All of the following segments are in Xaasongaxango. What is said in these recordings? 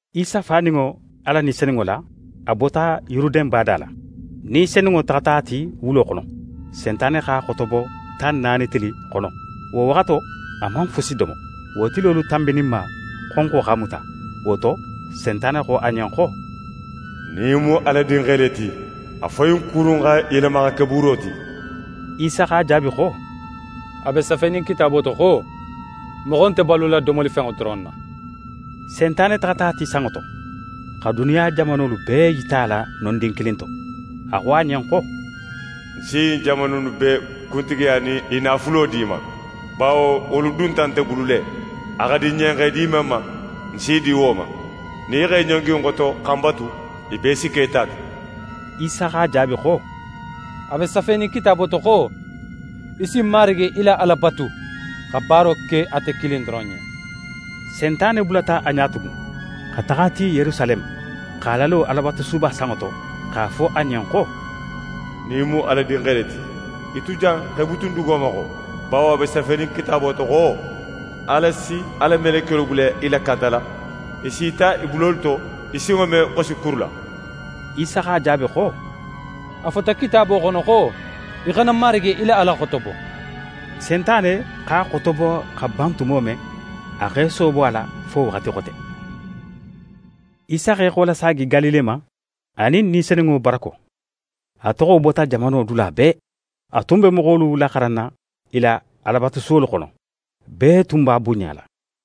Isa faninŋo Ala Ni Senunŋo la, a bota Yuruden bada la. Ni Senunŋo taxata a ti wulo xono. Sentane x'a xotobo tan naani tili xono. Wo waxato, a man fusi domo. Wo tilolu tanbininma, xonxo x'a muta. Wo to, Sentane xo a ɲen xo: «Nin í mu Ala Dinxe le ti, a fo ɲin kuru in xa yelema xa ke buuro ti.» Isa x'a jaabi xo: «A be safenin Kitaabo to xo: “Moxo nte balula domolifenŋo doron na.”» Sentane taxata a ti sanŋo to, xa duniya jamanolu bee yita a la nondin kilin to. A xo a ɲen xo: «Ń si ɲin jamanu innu bee kuntigiya nin i naafulo di í ma, bawo wolu dunta nte bulu le; a xa di ń ɲen x'e di men ma, ń s'i di wo ma. Nin í x'é ɲongi ń xoto xa ń batu, i bee si ke í ta ti.» Isa x'a jaabi xo: «A be safenin Kitaabo to xo: “Í si Marigi í la Ala batu, xa baaro ke ate kilin doron ɲen.”» Sentane bulata a ɲa tugun, xa taxa a ti Yerusaleme, x'a lalo Alabatusuba sanŋo to, x'a fo a ɲen xo: «Nin í mu Ala Dinxe le ti, í tu jan x'é butun dugo ma xo, bawo a be safenin Kitaabo to xo: “Ala si a la melekiyolu bula í lakantala. I s'í ta i bulolu to, í sinŋo me xosi kuru la.”» Isa x'a jaabi xo: «A fota Kitaabo xono xo: “Í xana Marigi í la Ala xotobo.”» Sentane x'a xotobo xa ban tumo men, a x'é soobo a la fo waxati xote. Isa x'é xolasaagi Galile ma, a nin Ni Senunŋo barako. A toxo bota jamano dula bee. A tun be moxolu laxaranna i la Alabatusuwolu xono. Bee tun b'a bunɲala.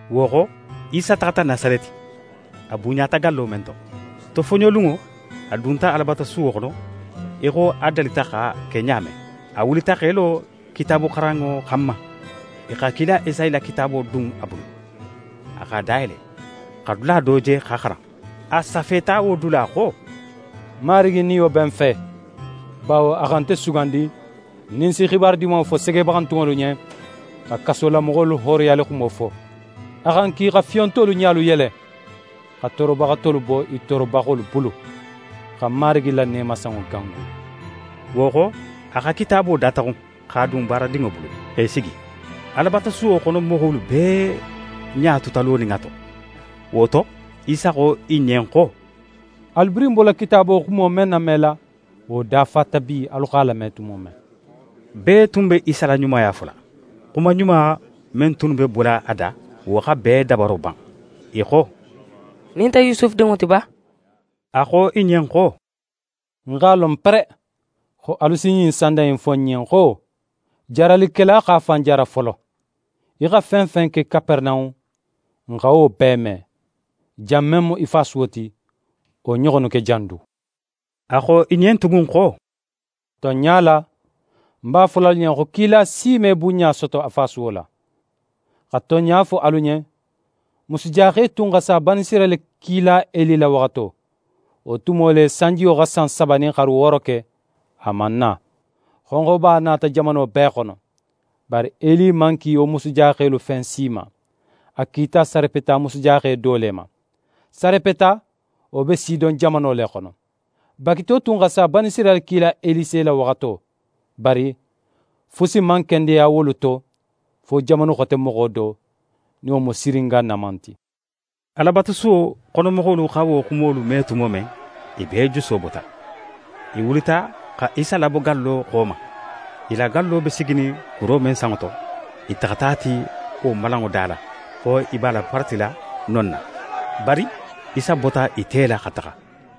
Wo xo, Isa taxata Nasareti, a bunɲata gallo men to. Tofoɲolunŋo, a dunta Alabatusuwo xono í xo a dalita x'a ke ɲa men. A wulita x'é lo kitaabuxaranŋo xanma. I xa kila Esayi la kitaabo dun a bulu. A x'a dayele, xa dula do je x'a xaran. A safeta wo dula xo: «Marigi Niyo be ń fe, bawo a xa nte sugandi nin ń si xibaru Dimanŋo fo segebaxantunŋolu ɲen, xa kasolamoxolu hooroyalixumo fo. A xa ń ki xa fiyontolu ɲalu yele, xa toorobaxatolu bo i toorobaxolu bulu, xa Marigi la neemasanŋo gangu.» Wo xo, a xa kitaabo dataxun, x'a dun baaradinŋo bulu, x'é sigi. Alabatusuwo xono moxolu bee ɲa tuta lonin a to. Wo to, Isa xo i ɲen xo: «Alu birin bola Kitaabo xumo men namela, wo dafata bi, alu x'a lame tumo men.» Bee tun be Isa la ɲumaya fola. Xuma ɲuma men tunnu be bola a da, wo xa bee dabaro ban. I xo: «Ɲin nte Yusufu dinŋo ti ba?» A xo i ɲen xo: «Ń x'a lon pere, xo alu si ɲin sanda in fo ń ɲen xo: “Jaaralikela x'a fan jaara folo. Í xa fen fen ke Kaperenahun, n xa wo bee me; jan men mu í fasuwo ti, wo ɲoxonnu ke jan du.”» A xo i ɲen tugun xo: «Tonɲa la, ń b'a fola alu ɲen xo kila si me bunɲa soto a fasuwo la. Xa tonɲa fo alu ɲen, musujaxe tun xa sa Banisirayila kila Eli la waxato. Wo tumo le, sanjiyo xa san saba nin xaru wooro ke, a man na; xonxoba nata jamano bee xono. Bari Eli man ki wo musujaxelu fen si ma. A kita Sarepeta musujaxe do le ma. Sarepeta, wo be Sidon jamano le xono. Bagito tun xa sa Banisirayila kila Elise la waxato; bari fusi man kendeya wolu to fo jamanu xote moxo do, nin wo mu Siringa Naman ti.» Alabatusuwo xono moxolu xa wo xumolu me tumo men, i bee juso bota. I wulita, xa Isa labo gallo xo ma. I la gallo be siginin kuro men sanŋo to, i taxata a ti wo malanŋo da la, xo i b'a laparatila non na. Bari Isa bota i te la xa taxa.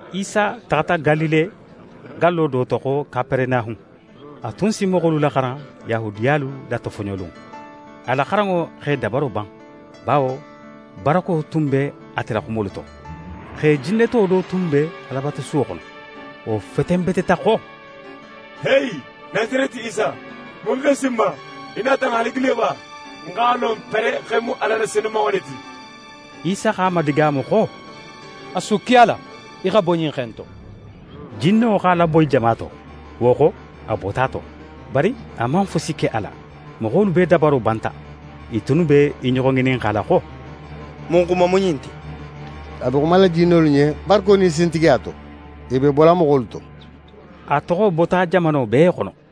Isa taxata Galile gallo do to xo Kaperenahun. A tun si moxolu laxaran Yahudiyalu la tofoɲolunŋo. A la xaranŋo x'e dabaro ban, bawo barako tun be ate la xumolu to. Xe jinneto do tun be Alabatusuwo xono. Wo fetenbeteta xo: «Heyi, Nasareti Isa, mun x'é si n ma? Í nata n halagi le ba? Ń x'a lon pere xo í mu Ala la Senumanŋo le ti.» Isa x'a madigaamu xo: «A sukki a la, í xa bo ɲin xe in to.» Jinno x'a laboyi jama to, wo xo, a bota a to. Bari a man fusi ke a la. Moxolu bee dabaro banta. I tunnu be i ɲoxo ŋininxala xo: «Mun xuma mu ɲin ti? A be xumala jinnolu ɲen barako nin sintigiya to, i be bola moxolu to.» A toxo bota jamano bee xono.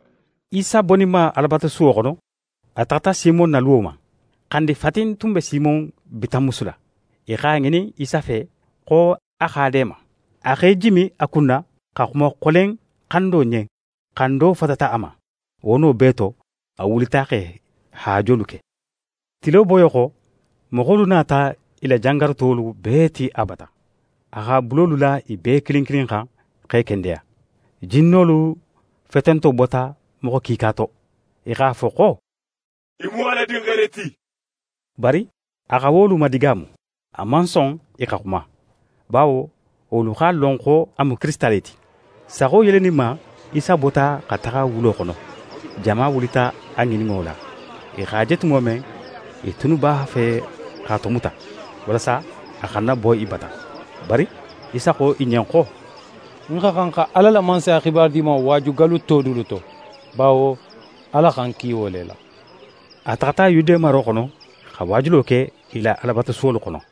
Isa boninma Alabatusuwo xono, a taxata Simon na luwo ma. Xandi fatin tun be Simon bitanmusu la. I x'a ŋinin Isa fe xo a xa a deema. A x'é jimi a kunna, xa xuma xolen xando ɲen. Xando fatata a ma. Wo no bee to, a wulita x'e haajolu ke. Tilo boyo xo, moxolu nata i la jangarutolu bee ti a bata. A x'a bulolu la i bee kilin kilin xan, x'e kendeya. Jinnolu fetento bota moxo kiika to. I x'a fo xo: «Í mu Ala Dinxe le ti.» Bari a xa wolu madigaamu. A man son i xa xuma, bawo wolu x'a lon xo a mu Kirisita le ti. Saxo yeleninma, Isa bota xa taxa wulo xono. Jama wulita a ŋininno la. I x'a je tumo men, i tunnu b'a fe x'a tomuta, walasa a xana bo i bata. Bari Isa xo i ɲen xo: «Ń xa xan xa Ala la Mansaya xibaru Dimanŋo waaju gallu to dulu to; bawo Ala xa ń ki wo le la.» A taxata Yude maro xono xa waajulo ke i la Alabatusuwolu xono.